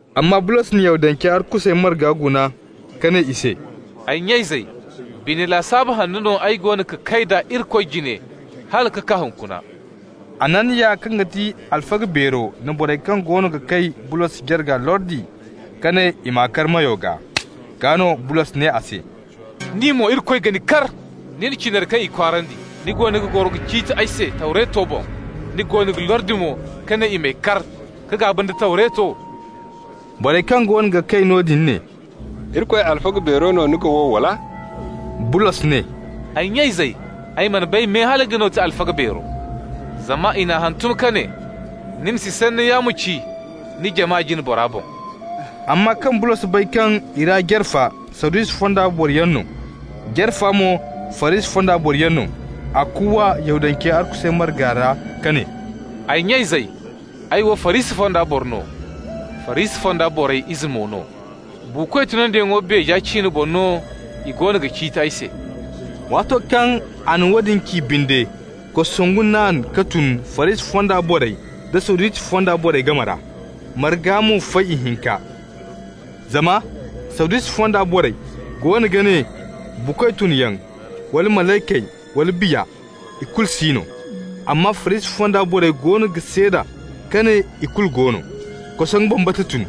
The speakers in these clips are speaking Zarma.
Amma Bulos na Yahudancey arkusey marga guna ka ne i se: « Ay nya-izey, bine lasaabu hanno no ay goono ka kay d'a Irikoy jine hala ka kaa hunkuna.» Hananiya, kaŋ ga ti alfaga beero na borey kaŋ goono ga kay Bulos jarga lordi ka ne i m'a kar meyo gaa. Gaa no Bulos ne a se: «Ni mo, Irikoy ga ni kar, nin cinari kaŋ i kwaarandi! Ni goono ga goro ka ciiti ay se Tawreto boŋ, ni goono ga lordi mo ka ne i m'ay kar ka gaaba nda Tawreto?» Borey kaŋ goono ga kay noodin ne: «Irikoy alfaga beero no ni ga wow, wala?» Bulos ne: «Ay nya-izey, ay mana bay me hala nga no ga ti alfaga beero. Zama i n'a hantum ka ne: ‹Ni ma si sanni yaamo ci ni jama jine bora boŋ.›» Amma kaŋ Bulos bay kaŋ i ra jare fa Sadusi fonda boroyaŋ no, jare fa mo Farisi fonda boroyaŋ no, a kuuwa Yahudancey arkusey marga ra ka ne: «Ay nya-izey, ay wo Farisi fonda boro no, Farisi fonda borey ize mo no. Buukoy tunyaŋo beeje ciine boŋ no i goono ga ciiti ay se.» Waato kaŋ a na woodin ci binde, kosongu naan ka tun Farisi fonda borey da Sadusi fonda borey game ra, marga mo fay ihinka. Zama Sadusi fonda borey goono ga ne buukoy tunyaŋ wala malaykey wala biya, ikulu si no. Amma Farisi fonda borey goono ga seeda ka ne ikulu go no. Kosongu bambata tun.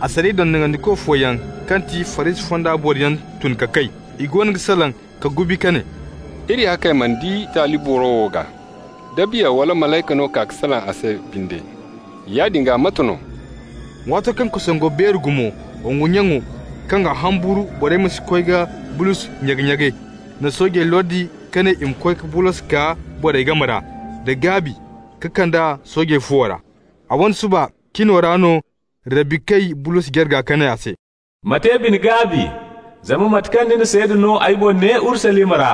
Asariya dondonandiko fooyaŋ kaŋ ti Farisi fonda boroyaŋ tun ka kay. I goono ga salaŋ ka gubi ka ne: «Iri ya kay mana di taali boro wo gaa. Da biya wala malayka no ka salaŋ a se binde, yaadin gaa mate no?» Waato kaŋ kosongo beeri gumo, wongu nyaŋo, kaŋ ga humburu borey ma si koy ka Bulos nyage-nyage, na soojey lordi ka ne i ma koy ka Bulos kaa borey game ra da gaabi ka kand'a soojey fuwo ra. A wane suba cino ra no Rabbi kay Bulos jarga ka ne a se: «Ma te bine-gaabi, zama mate kaŋ ni na seeda no ay boŋ ne Urusalima ra,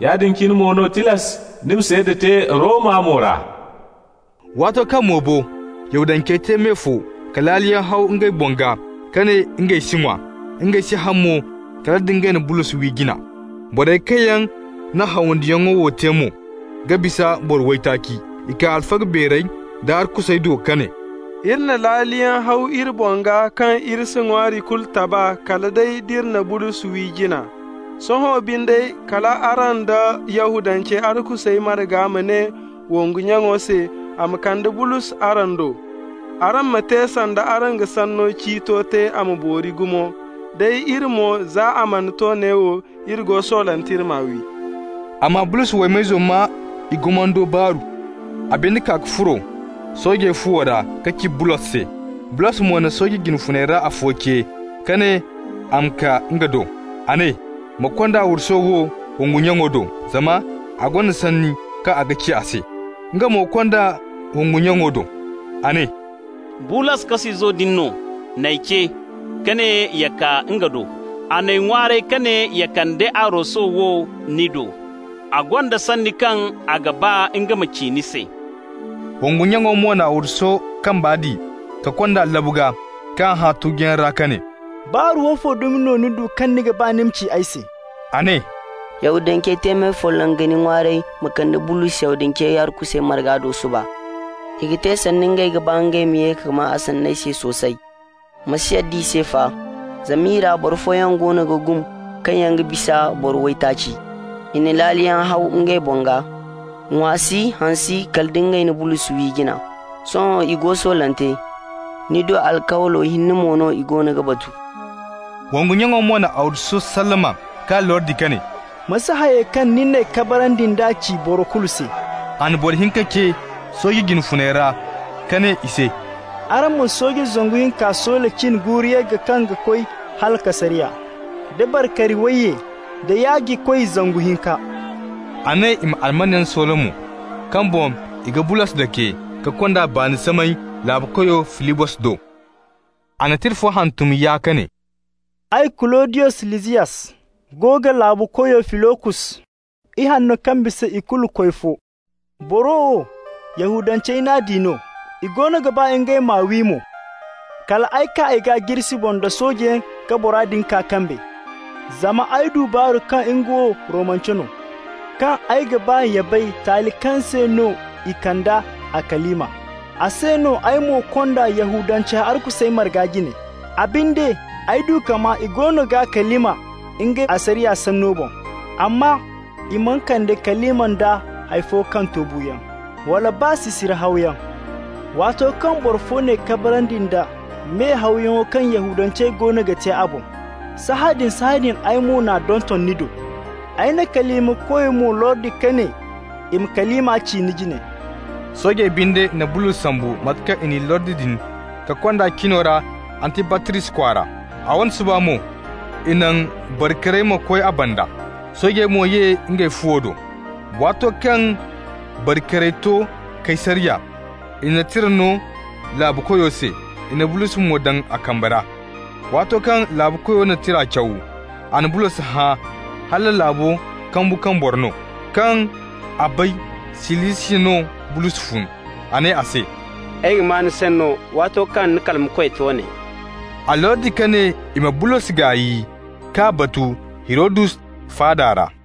yaadin cine mo no tilas ni ma seeda te Roma mo ra.» Waato kaŋ mo bo, Yahudancey te me fo ka laaliyaŋ haw ngey boŋ gaa ka ne ngey si ŋwa, ngey si haŋ mo kala nda ngey na Bulos wi jina. Borey kaŋ yaŋ na hawandiyaŋo wo te mo ga bisa boro waytaaci. I kaa alfaga beerey da arkusey do ka ne: «Iri na laaliyaŋ haw iri boŋ gaa kaŋ iri si ŋwaari kulu taba kala day d'iri na Bulos wi jina. Sohõ binde, kal araŋ da Yahudancey arkusey marga ma ne wongu nyaŋo se a ma kande Bulos araŋ do. Araŋ ma te sanda araŋ g'a sanno ciito te a ma boori gumo. Day iri mo, za a mana to neewo, iri go soolante iri m'a wi.» Amma Bulos waymayzo maa i gumando baaru. A binde kaa ka furo soojey fuwo ra ka ci Bulos se. Bulos mo na sooje jine funey ra afo ce ka ne a ma kaa nga do. A ne: «Ma konda arwaso wo wongu nyaŋo do, zama a gonda sanni kaŋ a ga ci a se.» Nga mo kond'a wongu nyaŋo do. A ne: «Bulos, kas'izo din no, n'ay ce ka ne ya kaa nga do. A n'ay ŋwaaray ka ne ya kande arwaso wo ni do. A gonda sanni kaŋ a ga ba nga ma ci ni se.» Wongu nyaŋo mo na arwaso kamba di ka kond'a labu gaa k'a hã tuguyaŋ ra ka ne: «Baaru woofo dumi no ni du kaŋ ni ga ba ni ma ci ay se?» A ne: «Yahudancey te me folloŋ ga ni ŋwaaray ma kande Bulos Yahudancey arkusey marga do suba. I ga te sanda i ga ba ngey ma ye ka maa a sanney no soosay. Ma si yadda i se fa, zama i ra boro fooyaŋ goono ga gum kaŋ yaŋ ga bisa boro waytaaci. I na laaliyaŋ haw ngey boŋ gaa, ŋwa si, haŋ si, kala nda ngey na Bulos wi jina. Sohõ i go soolante, ni do alkawlo hinne mo no i goono ga batu.» Wongu nyaŋo mo na arwaso sallama k'a lordi ka ne: «Ma si hayey kaŋ ni n'ay kabarandi nd'a ci boro kulu se.» A na boro hinka ce sooje jine funey ra ka ne i se: «Araŋ ma sooje zangu hinka soola cin guuru yagga kaŋ ga koy hala Kaysariya, da bari-kari wayye, da yaajikoy zangu hinka.» A ne i ma almanyaŋ soola mo kaŋ boŋ i ga Bulos dake ka kond'a baani samay laabukoyo Filikos do. A na tira fo hantum yaa ka ne: «Ay, Kuludiyos Lisiyas, go ga laabukoyo Filikos, ihanno kaŋ bisa ikulu koy, fo. Boro wo, Yahudancey n'a di no, i goono ga ba ngey m'a wi mo. Kal ay kaa i gaa jirsi boŋ nda soojeyaŋ ka bora din kaa kambe, zama ay du baaru kaŋ nga wo Romance no. Kaŋ ay ga ba ya bay taali kaŋ se no i kande a kalima, a se no ay mo kond'a Yahudancey arkusey marga jine. A binde, ay du ka maa i goono g'a kalima ngey asariya sanni boŋ, amma i mana kande kalima nda hay fo kaŋ to buuyaŋ, wala baa sisiri hawyaŋ. Waato kaŋ boro fo n'ay kabarandi nda me-hawyaŋo kaŋ Yahudancey goono ga te a boŋ, sahãadin-sahãadin ay mo n'a donton ni do. Ay n'a kalimakoy mo lordi ka ne i m'a kalima ci ni jine.» Soojey binde na Bulos sambu mate kaŋ i n'i lordi din ka kond'a cino ra Antibatris kwaara. A wane suba mo i naŋ bari-karey ma koy a banda. Soojey mo ye ngey fuwo do. Waato kaŋ bari-karey to Kaysariya, i na tira no laabukoyo se, i na Bulos mo daŋ a kambe ra. Waato kaŋ laabukoyo na tira caw, a na Bulos hã hala laabo kambu kaŋ boro no. Kaŋ a bay Silisiya no Bulos fun, a ne a se: «Ay ga maa ni sanno waato kaŋ ni kalimakoy to ne.» A lordi ka ne i ma Bulos gaay k'a batu Hirodus faada ra.